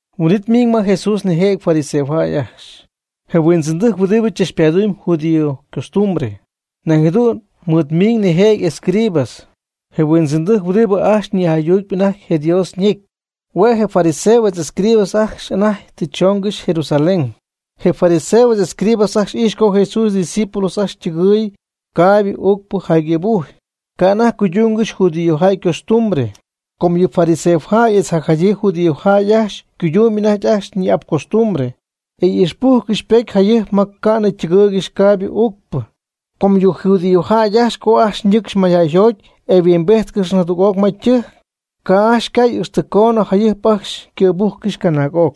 Huin'it ymiiñ ma Jesús nijëjɨty fariseojäy ajcxy, je huindzɨndɨjc huɨdibɨ tzachpadumb judío ycostumbre. Nañ jadu'n mɨɨd miiñ nijëjɨty escribas, je huindzɨndɨjc huɨdibɨ ajcxy nïjaydutp anajty Dios ñecy. Hue' je fariseos etz escribas ajcxy anajty tɨ choongɨxy Jerusalén. Je fariseos etz escribas ajcxy ijxy co Jesús ydiscípulos ajcxy ytɨgɨɨy caaybɨ uucpɨ jaygɨ̈bujy, ca' anajty cuydúngɨxy judíojäy ycostumbre. (Com yɨ fariseojäy etz jacjadyii judíojäy ajcxy cuydumby anajty ajcxy ñi'ap costumbre, e ixpocypújcɨxy jayɨjp ma ca'nɨ ytɨgɨɨygɨxy caaybɨ uucpɨ. Com yɨ judíojäy ajcxy co ajcxy ñɨcxy mayjäyjoty etz yhuimbíjtcɨxy jadüg'oc ma ytɨjc, ca' ajcxy ycay ixtɨ coonɨ jayɨjp ajcxy ycɨ̈bújcɨxy canaag'oc.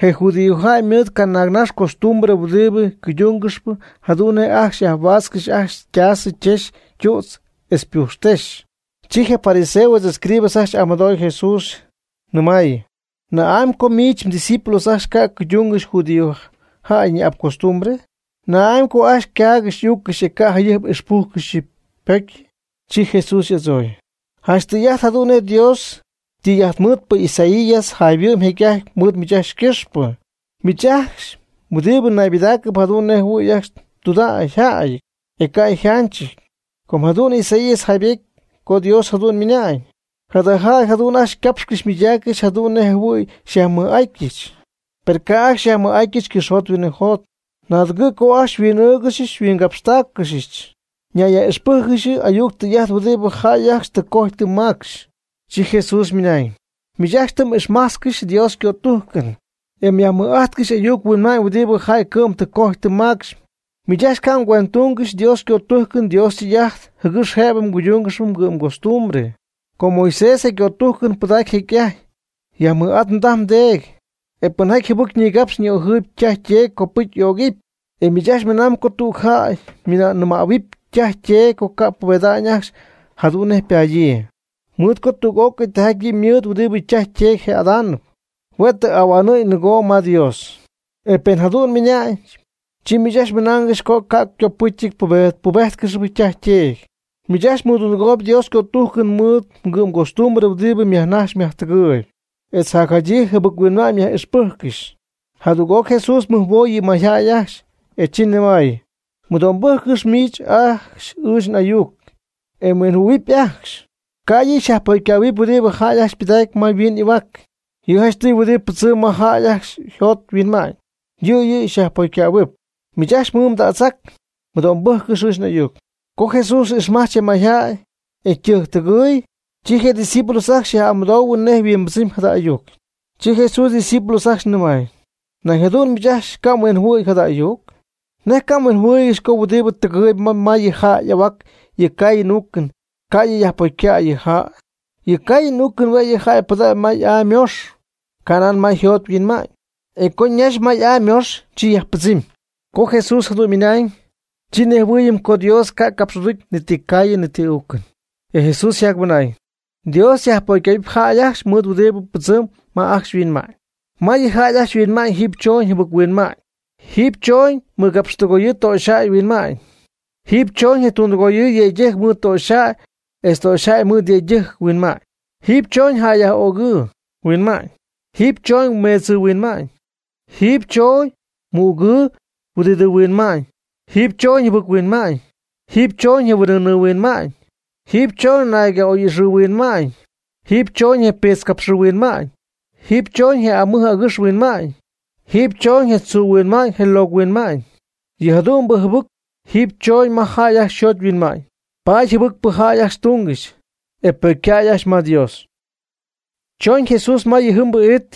Yɨ judíojäy ymɨɨd canaagnax costumbre huɨdibɨ cuydúngɨxyp jadu'n nej ajcxy yajhuaatzcɨxy ajcxy ytaasɨ ytexy ytütz etz ypujxtexy.) Chi je fariseos etz escribas ajcxy y'amɨdooy Jesús, nɨmaayɨ: ―¿Na'amy co miich mdiscípulos ajcxy ca' cuydúngɨxy judíojäy ñi'ap costumbre? ¿Na'amy co ajcxy ycaaygɨxy y'úccɨxy, e ca' jayɨjp ixpújcɨxy yɨ' ypocyɨ? Chi Jesús y'adzooy: ―Janch tɨy'ajt jadu'n nej je Dios ytɨy'ajtmɨɨdpɨ Isaías jayhuɨ'my jecy'ajty mɨɨd miich ajcxy ycɨxpɨ. Miich ajcxy huɨdibɨ naybɨdaacɨp jadu'n nej jɨhuɨ̈y ajcxy tudägyjäy, e ca' yjánchɨ́ty. Com jadu'n Isaías jaybejty co Dios jadu'n ymɨnañ: Jada jäy jadu'n ajcxy ycapxcɨxy ymɨydaaccɨxy jadu'n nej jɨhuɨ̈y xyajmɨj'atyɨch. Per ca' ajcxy xyajmɨj'atyɨch cɨxyjot huinɨjot. Naadɨgɨ̈ co ajcxy xyhuin'ɨ́ɨgɨxɨch xyhuinyáaxcɨxɨch. Ñayyaj'ixpɨ́jcɨgɨxy ayuc tɨy'ajt huɨdibɨ jäy ajcxy tɨ cojy tɨ macxy. Chi Jesús ymɨnañ: ―Miich ajcxy tɨ m'ixmájtzcɨxy Dios ycötújcɨn, e myajmɨj'ájtcɨxy ayuc huinma'ñ huɨdibɨ jäy cɨ'm tɨ cojy tɨ macxy. Miich ajcxy ca' mgüendtúngɨxy Dios ycötújcɨn Dios ytɨy'ajt jɨgɨx jëbɨ cuydúngɨxy mgɨ'm costumbre. Com Moisés je cötújcɨn ypɨdac jecy'ajty: “Yajmɨj'at mdaj mdeedy”, e “Pɨnjaty jɨbɨc nigapx ni'ojɨɨyb ytaj yteedy, copɨcy y'ögɨp.” E miich ajcxy mɨnañ co tüg jäy nɨmähuɨp ytaj yteedy co ca' pubeda'ñ ajcxy jadu'n nej padyii, mɨɨd co tüg'ócɨy tijaty yɨ' ymɨɨd huɨdibɨ ytaj yteedy jë'adánɨp, hue' tɨ ahuanɨ̈y nɨgoo ma Dios. E pen jadu'n mɨnañ, chi miich ajcxy mɨnaangɨxy co ca' copɨ́cyɨty mbubéjtcɨxɨpy mdaj mdeedy. Miich ajcxy mɨdundɨgooyb Dios ycötújcɨn mɨɨd mgostumbre huɨdibɨ myajnajxyp myajtɨgɨɨyb, etz jacjadyii jɨbɨc-huinma'ñ myaj'ixpɨ́jccɨxy. Jadüg'oc Jesús mɨjhuoy yɨ mayjäy ajcxy, e chi nɨmay: ―Mɨdo'mbɨ́jccɨx miich ajcxy ɨɨch n'ayuc, e mhuinjɨhuɨ̈huɨp ajcxy. Ca' yɨ' yajpocycähuɨɨyb huɨdibɨ jäy ajcxy ypɨdacy ma yhuin y'ahuac. Yɨ' janchtɨy huɨdibɨ pɨdzɨm ma jäy ajcxy yjot yhuinma'ñ, yɨ' yɨ' yajpocycähuɨɨb. Miich ajcxy mmɨɨd mdätzac, mɨdo'mbɨ́jccɨx ɨɨch n'ayuc. Co Jesús ixmajch je mayjäy, e ytɨjctɨgɨɨy, chi je discípulos ajcxy yaj'amɨdoohuɨ nej yhuimbɨdzɨmy jada ayuc. Chi Jesús ydiscípulos ajcxy nɨmay: ―¿Nej nañ jadu'n miich ajcxy ca' mhuinjɨhuɨ̈y jada ayuc? ¿Nej ca' mhuinjɨhuɨɨygɨxy co huɨdibɨ tɨgɨɨy ma yɨ jäy y'ahuac (yɨ caayɨn uucɨn), ca' yɨ' yajpocycäy yɨ jäy? Yɨ caayɨn uucɨn hue' yɨ jäy ypɨdägy ma y'aa ymoox ca' nan ma yjot yhuinma'ñ, e co ñax ma y'aa ymox, chi ypɨdzɨmnɨ. Co Jesús jadu'n ymɨna'ñ, chi nejhuɨɨyɨm co Dios ca' capx'aducy ni ti caayɨn ni ti uucɨn. E Jesús yjacmɨnañ: ―Dios yajpocycähuɨp jäy ajcxy mɨɨd huɨdibɨ pɨdzɨmb ma ajcxy yhuinma'ñ. Ma yɨ jäy ajcxy yhuinma'ñ jiiby chooñ jɨbɨc-huinma'ñ; jiiby chooñ mɨgapxtɨgoyɨɨ töxyjäy yhuinma'ñ; jiiby chooñ je tundɨgooyɨɨ yëydɨjc mɨɨd töxyjäy etz töxyjäy mɨɨd yëydɨjc huinma'ñ; jiiby chooñ jäyyaj'ögɨɨ huinma'ñ; jiiby chooñ meedzɨɨ huinma'ñ; jiiby chooñ mügɨɨ huɨdidɨɨ huinma'ñ; jiiby chooñ jɨbɨc-huinma'ñ; jiiby chooñ je huin'ɨɨnɨɨ huinma'ñ; jiiby choñ nayca'oy'ixɨɨ huinma'ñ; jiiby chooñ je piitzcapxɨɨ huinma'ñ; jiiby chooñ je amɨj agɨx huinma'ñ; jiiby chooñ je tzuu huinma'ñ je locɨ huinma'ñ. Yɨ jadu'mbɨ jɨbɨcpɨ jiiby chooñ ma jäy ajcxy yjot yhuinma'ñ, paady jɨbɨcpɨ jäy ajcxy túngɨxy, e ypocycäy ajcxy ma Dios. Chooñ Jesús ma yɨjɨmbɨ it,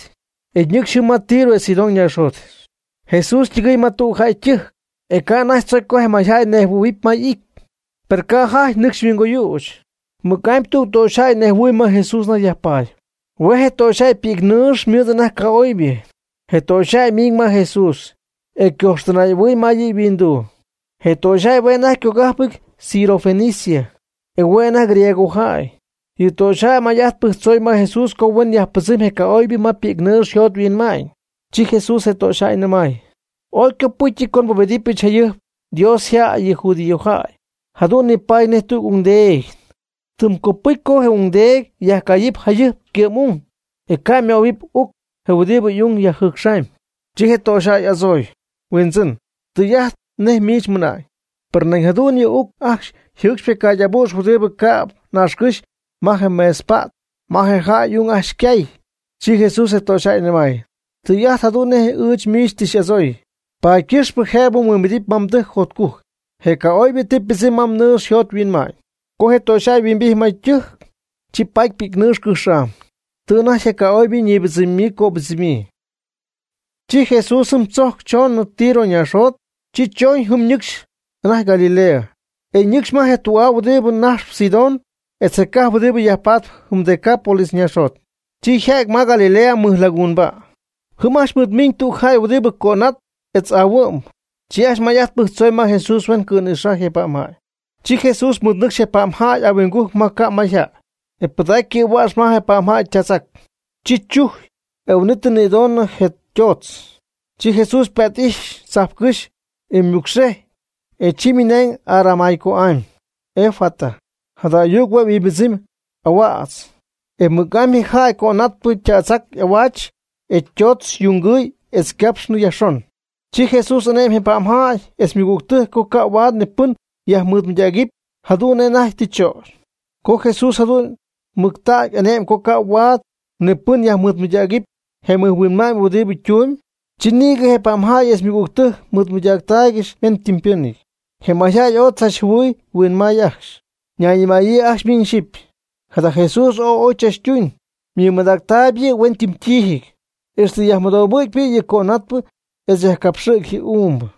e ñɨcxy jɨm ma Tiro etz Sidón ñaaxjot. Jesús ytɨgɨy ma tüg jäy ytɨjc, e ca' anajty tzocy co je mayjäy ñejhuɨ̈huɨɨyb ma y'ity. Per ca' jajty nɨcx yhuingoyüch. Mɨc'amy tüg töxyjäy nejhuɨɨy ma Jesús anajty yajpaady. Hue' je töxyjäy ypi'cnɨɨx ymɨɨd anajty ca'oybɨ. Je töxyjäy ymiiñ ma Jesús, e ycojxtɨnay'ahuɨy ma yɨ' yhuinduu. Je töxyjäy hue' anajty ycogájpɨty Sirofenicia (e hue' anajty griegojäy). Yɨ töxyjäy may'ajt pɨjctzoy ma Jesús co huen yajpɨdzɨmy je ca'oybɨ ma ypi'cnɨɨx yjot yhuinma'ñ. Chi Jesús je töxyjäy nɨmay: ―Ooy ycopɨ́cyɨty co nbubedɨpyɨch jayɨjp Dios yjäy (yɨ judíojäy). Jadu'n nipaady nej tüg ungdeedy. Tɨm copɨcy co je ungdeedy yajcayɨpy jayɨjp ycɨ'm ung, e ca' möhuɨp uc je huɨdibɨ y'ung yajjɨcxaamy. Chi je töxyjäy y'adzooy: ―Huindzɨn, tɨy'ajt nej miich mmɨna'ñ, per nañ jadu'n yɨ uc ajcxy yjɨɨcxyp je caagy abu'x huɨdi cäb naaxcɨ́xy ma mesɨpa't ma je jäy y'ung ajcxy ycaay. Chi Jesús je töxyjäy nɨmay: ―Tɨy'ajt jadu'n nej ɨɨch miich tɨ xy'adzooy, paady ycɨxpɨ jëb mhuimbidɨpy ma mdɨjc jotcujc, je ca'oybɨ tɨ ypɨdzɨmy ma mnɨɨx yjot yhuinma'ñ. Co je töxyjäy huimbijty ma ytɨjc, chi paty ypi'cnɨɨx cɨjx'am, tɨ anajty je ca'oybɨ ñïbɨdzɨmyii ycöbɨdzɨmyii. Chi Jesús jɨm tzojcɨ choonɨ Tiro ñaaxjot. Chi chooñ jɨm ñɨcxy anajty Galilea, e nɨcxy ma je tü'aa huɨdibɨ najxp Sidón etz je cajp huɨdibɨ yajpatp jɨm Decápolis ñaaxjot, chi yja'ty ma Galilea mɨj laguunba'. Jɨm ajcxy mɨɨd miiñ tüg jäy huɨdibɨ cönátɨp etz aahuɨ'mb. Chi ajcxy may'ajt pɨjctzooy ma Jesús huen cɨ̈nïxajy je pa'mjäy. Chi Jesús mɨɨdnɨcxy je pa'mjäy ahuingujc ma ca' mayjäy, e pɨdacy ycɨ̈hua'x ma je pa'mjäy ytätzac. Chi chujy, e huin'it nïdonɨ je ytoodz. Chi Jesús ypa't'ijxy tzajpcɨ́x, e ymɨcxejy, e chi ymɨnañ Aramaico'amy: ―Efata ―jada ayuc hue' yhuimbɨdzɨmy: Ahuädz. E mɨc'amy je jäy cönatpɨ ytätzac y'ahuaach etz ytoodz yungɨɨy etz ycapxnɨ yajxon. Chi Jesús ane'my je pa'mjäy etz ymɨgügtɨjc co ca' huaad ni pɨn yajmɨɨdmɨydägɨpy jadu'n nej anajty tɨ chögy. Co Jesús jadu'n mɨctägy ane'my co ca' huaad ni pɨn yajmɨɨdmɨydägɨpy je mɨjhuinma'ñ huɨdibɨ ytumyb, chi nïgɨ je pa'mjäy etz ymɨgügtɨjc mɨɨdmɨydaaccɨxy hueñypɨ́nɨty. Je mayjäy ooy tzachjɨhuɨy huinmay ajcxy, ñayñɨmaayɨ ajcxy miñ xyɨpy: ―Jada Jesús ooy oy chachtuñ. Ymɨmadactaayb yɨ'huenytɨmytíijɨty, ixtɨ yajmɨdohuɨ̈cpy yɨ' yɨ cönatpɨ etz yajcapxɨ̈gy yɨ uumbɨ.